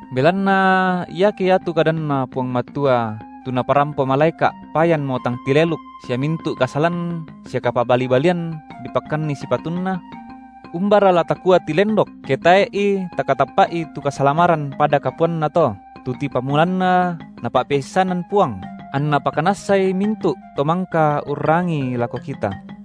Belanna iake iatu kadanNa Puang Matua tu naparampo malaeka’ payanmo tang tileluk sia mintu’ kasalan sia kapabali-balian dipakkanni sipatunna, umbara la takua tilendok, ke tae’i takatappa’i tu kasalamaran pada kapuanato, tu tipamulanna Napa’peissanan Puang, anna pakanassai mintu’ to mangka urrangii lako kita;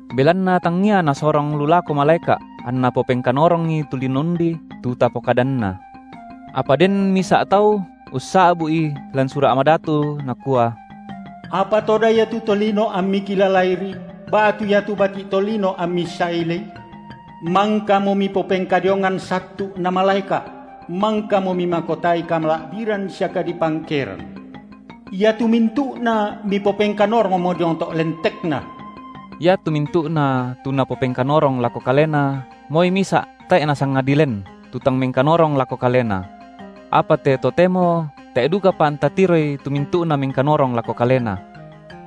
Belanna tangia Nasorong lu lako malaeka’ anNa popengkanorongi tu lino undi, tu tapokadanna. Apa den misa’ tau ussa’bu’i lan Sura’ Madatu, nakua: Apa toda ia tu tolino amMi kilalairi, ba’tu iatu bati’ tolino amMi sailei? Mangkamo Mipopengkadiongan sattu’ na malaeka’; mangkamo Mimakotai kamala’biran sia kadipangkeran, iatu mintu’na Mipopengkanorongmo diong to’ lentekNa. Iatu mintu’na tu Napopengkanorong lako Kalena, moi misa’ tae’ Nasangadi len, tu tang mengkanorong lako Kalena. Apa te totemo tae’ dukapa anta tiroi tu mintu’na mengkanorong lako Kalena.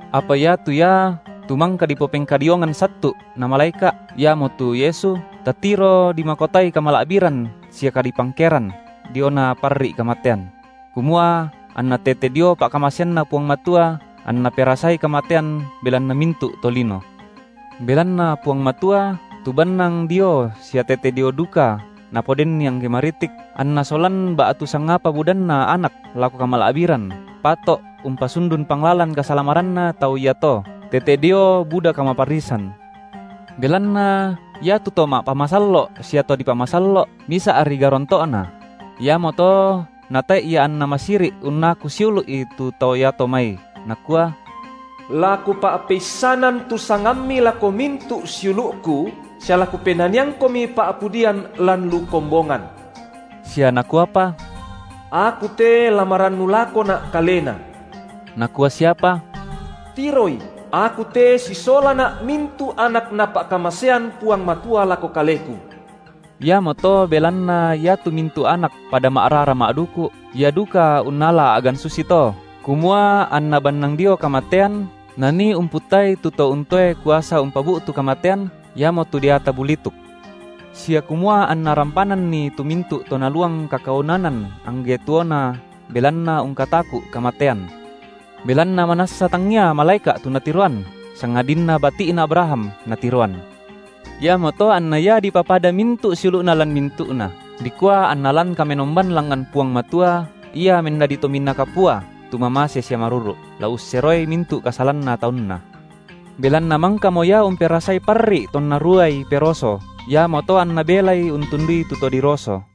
Apa iatu Ia tu mangka dipopengkadiongan sattu’ na malaeka’, iamotu Yesu, tatiro dimakotai kamala’biran sia kadipangkeran, diona parri’ kamatean; kumua anna tete dio pa’kamaseanNa Puang Matua anNa perasai kamatean belanna mintu’ tolino. Belanna Puang Matua, tu bannang Dio sia tete Dio duka napodenNi angge maritik, anNa solan ba’tu sangapa budanna anak lako kamala’biran, pato’ umpasundun Panglalan kasalamaranna tau iato, tete dio buda kamaparrisan. Belanna iatu To ma’pamasallo’ sia to di pamasallo’, misa’ri garonto’na: iamoto Natae’ Ia anNa masiri’ unnaku siulu’i tu tau iato mai, Nakua: La Kupa’peissanan tu sangamMi lako mintu’ siulu’Ku, sia la KupenaniangKomi pa’pudian lan lu kombongan. Sia Nakuapa: Aku te la marannu lakoNa’ Kalena. Nakua siapa: Tiroi, Aku te sisolana’ mintu’ anak Napa’kamasean Puang Matua lako Kaleku. Iamoto belanna iatu mintu’ anak pada ma’rara ma’duku’, Ia duka unnala a’gan susito, kumua anNa bannang dio kamatean Nanii umputtai tu to untoe kuasa umpabu’tu kamatean, iamotu deata bulituk. Sia kumua anNa rampananni tu mintu’ to naluang kakaunanan angge tuona belanna ungkataku’ kamatean. Belanna manassa tangia malaeka’ tu Natiroan, sangadinna bati’na Abraham Natiroan. Iamoto anNa Ia dipapada mintu’ siulu’Na lan mintu’na, dikua anNa lan kamenomban langngan Puang Matua Ia mendadi Tominaa Kapua tu mamase sia maruru’, la usseroi mintu’ kasalanna taunNa. Belanna mangkamo Ia umperasai parri’ tonna ruaI peroso, iamoto anNa belai untundui tu to diroso.